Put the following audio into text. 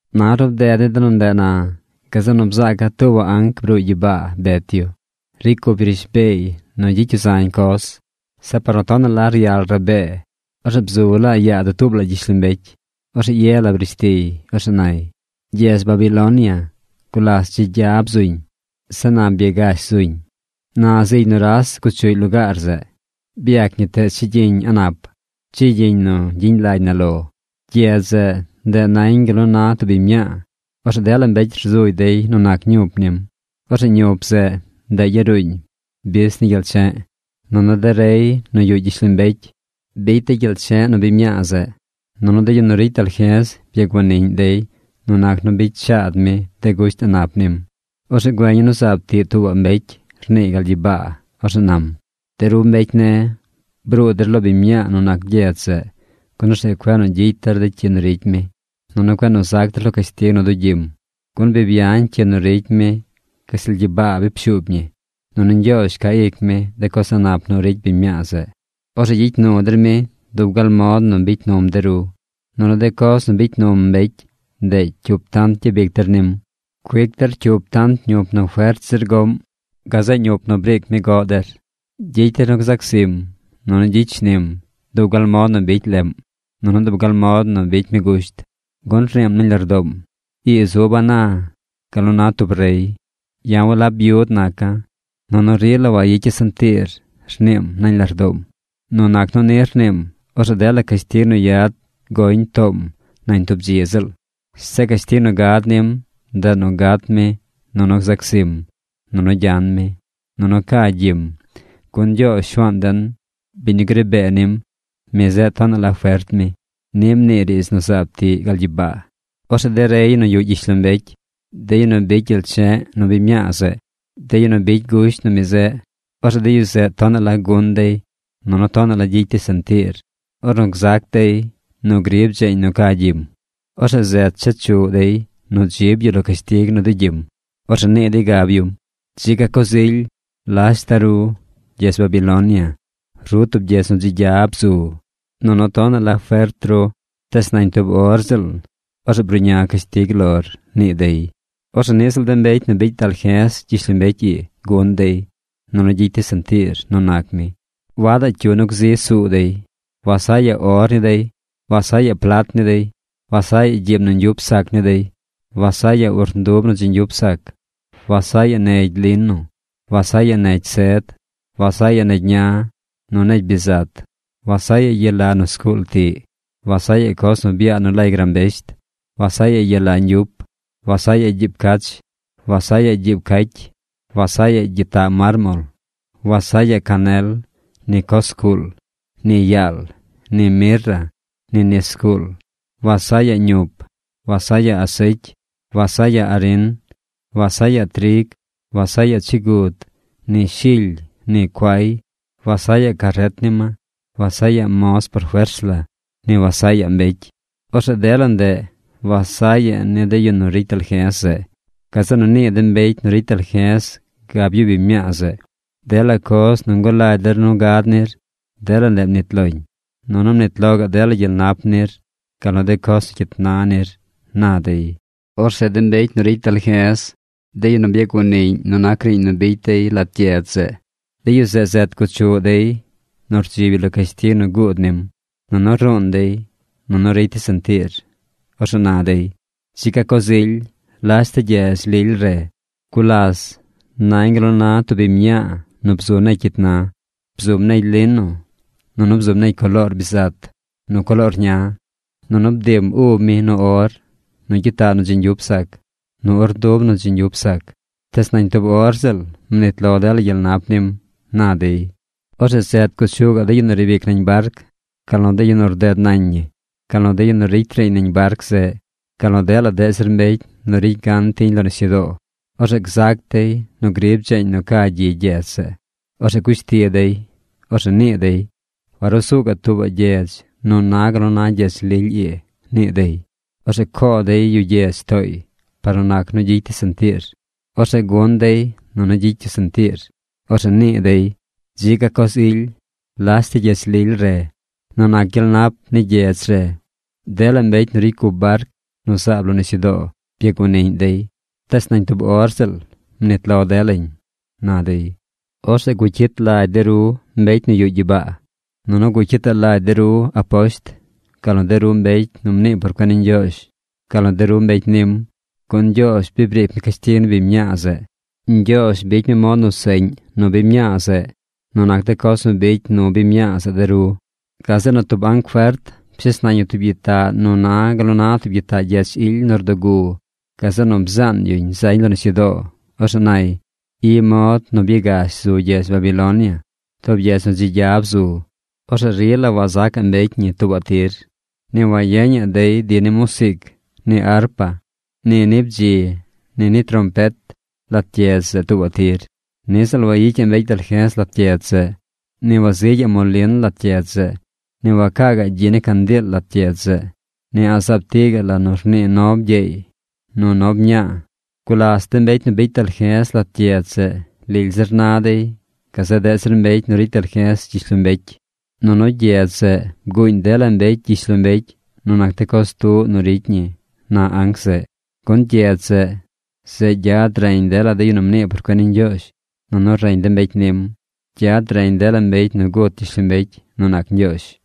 Na ornu bded ni de nu ndeꞌ na, gazeꞌ nu bzaaca̱ tuubaꞌ anc bruuy gyibaa bet yu. Ricy cup yu rishbeey nu gyicy yu zañ coz. Zeꞌ par nu tonaꞌ la ryal rabee, orzeꞌ bzu la yaa dutuub la gyishlombecy. Orzeꞌ ye la brish tiy. Orzeꞌ nay: ―Gyedz Babilonia gulas dzi gya bzuñ. Zeꞌ na byagash zuñ. Na zigy nuras guchuꞌy lugaar zeꞌ. Byac ñi teez chigyiñ a̱ꞌ nap, chigyiñ nu gyiñ lagy na lo. Gyedz zeꞌ, ndeꞌ nañ gal nu na tub biñ mñaa. Orzeꞌ dela mbecy rzugy dey nu nac ñup nim. Orzeꞌ ñup zeꞌ, ndeꞌ yaruuñ bis ni gyel che̱ꞌ. Nunu de rey nu yuꞌ gyishlombecy bicy dey gyel che̱ꞌ nu biñ mñaa zeꞌ. Nunu de yu nu ricy dalje̱z byaguaniꞌñ dey nu nac nu bicy shaad mi de gusht a̱ꞌ nap nim. Orzeꞌ güeña̱ nu zaab tiꞌ tuubaꞌ mbecy rniiy gal gyibaa. Orzeꞌ nam: ―De ru mbecy ne̱, bruu der lo biñ mñaa nu nac gyedz zeꞌ, gun orzeꞌ cueꞌ nu gyicy der de cyi nu ricy mi, nunu cueꞌ nu zac der lo cashtig nu dugyim. Gun bi byañ cyi nu ricy mi gashtal gyibaa bi pshuub ñi. Nunu Ñgyoozh ca ic mi de coz a̱ꞌ nap nu ricy biñ mñaa zeꞌ. Orzeꞌ gyicy nu der mi dub gal mod nu bicy num de ru. Nunu de coz nu bicy num mbecy, ndeꞌ cyup tant gyabic der nim. Cuic der cyup tant ñup nu fert zir goꞌm gazeꞌ ñup nu briic mi goꞌ der. Gyicy der nu gzac zim, nunu gyicy shnim dub gal mod nu bicy leꞌm, nunu dub gal mod nu bicy mi gusht. Gun rniim nañ lardoom: “Ii zuba̱ na gal nu na tub rey. Ya̱ walab byud naca̱. Nunu rila wayicya̱ sentiir”, rniim nañ lardoom. Nu nac nu ni rniim, orzeꞌ dela cashtig nu yad goñ toom nañ tub dzi ziꞌl. Zeꞌ cashtig nu gad nim, ndeꞌ nu gat mi, nu gzac zim, nunu nu gyan mi. Nunu ca gyim, gun Ñgyoozh Shuaan den, biñ nu gri bee nim, mi zeꞌ tonaꞌ la fert mi. ―Ni mnii riidz nu zaab tiꞌ gal gyibaa. Orzeꞌ de rey nu yuꞌ gyishlombecy, de yu nu bicy gyel che̱ꞌ nu biñ mñaa zeꞌ, de yu nu bicy gusht nu mi zeꞌ, orzeꞌ de yu zeꞌ tonaꞌ la gun dey nunu tonaꞌ la gyicy dey sentiir ornu zac dey nu grib dzeeñ nu ca gyim. Orzeꞌ zet chechuꞌ dey nu dzib yu lo cashtig nu dugyim. Orzeꞌ nii dey gab yum: ―¡Dzi ga coz ily! ¡Lashta ru, gyedz Babilonia! Ru tub gyedz nu dzi gya bzu. Nunu tonaꞌ la fert ru. Tees nañ tub or ziꞌl, orzeꞌ bruꞌña cashtig lor ―nii dey. Orzeꞌ niꞌ ziꞌl de mbecy nu bicy dalje̱z gyishlombecy ii gun dey, nunu gyicy dey sentiir nu nac mi. Wadaꞌ cyu nu gzi suu dey. Wasaꞌyaꞌ or ni dey. Wasaꞌyaꞌ plat ni dey. Wasaꞌyaꞌ gyiib nu ñgyup sac ni dey. Wasaꞌyaꞌ urndub nu dzi ñgyup sac. Wasaꞌyaꞌ negy lino. Wasaꞌyaꞌ negy sed. Wasaꞌyaꞌ negy ña, nu negy bizat. Wasaꞌyaꞌ yala nu zguul tiꞌ. Wasaꞌyaꞌ coz nu byaa nu lay grambesht. Wasaꞌyaꞌ yala ñgyup. Wasaꞌyaꞌ gyiib cach. Wasaꞌyaꞌ gyiib cacy. Wasaꞌyaꞌ gyitaꞌ mármol. Wasaꞌyaꞌ canel, ni coz zguul, ni yaal, ni mirra, ni nis zguul. Wasaꞌyaꞌ ñup. Wasaꞌyaꞌ asecy. Wasaꞌyaꞌ arin. Wasaꞌyaꞌ trig. Wasaꞌyaꞌ chigud, ni shily, ni cuay. Wasaꞌyaꞌ caret ni ma. Wasaꞌyaꞌ moz por fers la. Ni Wasaꞌyaꞌ mbecy. Orzeꞌ dela ndeꞌ Wasaꞌyaꞌ ni de yu nu ricy dalje̱z zeꞌ. Gazeꞌ nu nii de mbecy nu ricy dalje̱z gab yu biñ mñaa zeꞌ: ―Dela coz nu ngulagy der nu gad nir, dela ndeꞌ mnit loñ. Nunu mnit lo gaꞌ dela gyel nap nir, gal nu de coz nu cyit na nir ―na dey. Orzeꞌ de mbecy nu ricy dalje̱z, de yu nu byaguaniꞌñ nu nac riiñ nu bicy dey lat gyedz zeꞌ, de yu zeꞌ zet guchuꞌ dey nu rdzib yu lo cashtig nu guud nim. Nunu ruun dey nunu ricy dey sentiir. Orzeꞌ na dey: ―¡Dzi ga coz ily! ¡Lashta gyedz lily re! Gulas nañ gal nu na tub biñ mñaa nu bzu negy cyit na. Bzum negy lino. Nunu bzum negy coloor bizat nu coloor ña. Nunu bdiim ub mi nu or, nu gyitaꞌ nu dzi ñgyup sac, nu urndub nu dzi ñgyup sac. Tees nañ tub or ziꞌl mnit lo dela gyel nap nim ―na dey. Orzeꞌ zet guchuꞌ gaꞌ de yu nu riib ic nañ barc, gal nu de yu nu rded nañ ñi, gal nu de yu nu ricy riiñ nañ barc zeꞌ, gal nu dela deꞌ zir mbecy nu ricy gan tiñ lo nisyudoo. Orzeꞌ gzac dey nu grib dzeeñ nu ca gyi gyedz zeꞌ. Orzeꞌ cush ti dey. Orzeꞌ nii dey: ―Warusuu gaꞌ tuubaꞌ gyedz nu na gal nu na gyedz lily ii ―nii dey. Orzeꞌ coo dey yu gyedz tooy par nu nac nu gyicy dey sentiir. Orzeꞌ gun dey nu gyicy yu sentiir. Orzeꞌ nii dey: ―¡Dzi ga coz ily! ¡Lashta gyedz lily re! Nu nac gyel nap ni gyedz re, dela mbecy nu ricy cup barc nu zaab lo nisyudoo byaguaniꞌñ dey. Tees nañ tub or ziꞌl mnit lo delañ ―na dey. Orzeꞌ gucyit lagy de ru mbecy nu yuꞌ gyibaa. Nunu gucyitaꞌ lagy der aposht, gal nu de ru mbecy nu mnii por cuen ni Ñgyoozh, gal nu de ru mbecy nim, gun Ñgyoozh bi briic mi cashtig ni biñ mñaa zeꞌ. Ñgyoozh bicy mi mod nu seꞌñ nu biñ mñaa zeꞌ nu nac de coz nu bicy nu biñ mñaa zeꞌ de ru. Gazeꞌ nu tub anc fert pshes nañ yu tub gyitaꞌ nu na gal nu na tub gyitaꞌ gyech ily nu rdugu. Gazeꞌ nu bzaan yuñ zañ lo nisyudoo. Orzeꞌ nay: ―I mod nu byagash zu gyedz Babilonia, tub gyedz nu dzi gya bzu. Orzeꞌ rila wansacaꞌ mbecy ñi tuubaꞌ tir. Ni wayeñaꞌ dey di ni musiic ni arpa, ni ni bdzi, ni ni trompet lat gyedz zeꞌ tuubaꞌ tir. Niꞌ ziꞌl wayicyaꞌ mbecy dalje̱z lat gyedz zeꞌ. Ni wazigyaꞌ molin lat gyedz zeꞌ. Ni wacaa gaꞌ gyi ni candiil lat gyedz zeꞌ. Ni a̱ꞌ zaab tiꞌ gaꞌ la nu rnii nob gyeey nu nob mñaa. Gulas de mbecy nu bicy dalje̱z lat gyedz zeꞌ lily zir na dey gazeꞌ deꞌ zir mbecy nu ricy dalje̱z gyishlombecy. Nunu gyedz zeꞌ bguuñ dela mbecy gyishlombecy nu nac de coz tuꞌ nu ricy ñi ―na anc zeꞌ. Gun gyedz zeꞌ, zeꞌ gyad reñ dela de yu nu mnii por cuen ni Ñgyoozh, nunu reñ de mbecy nim. Gyad reñ dela mbecy nu gut gyishlombecy nu nac Ñgyoozh.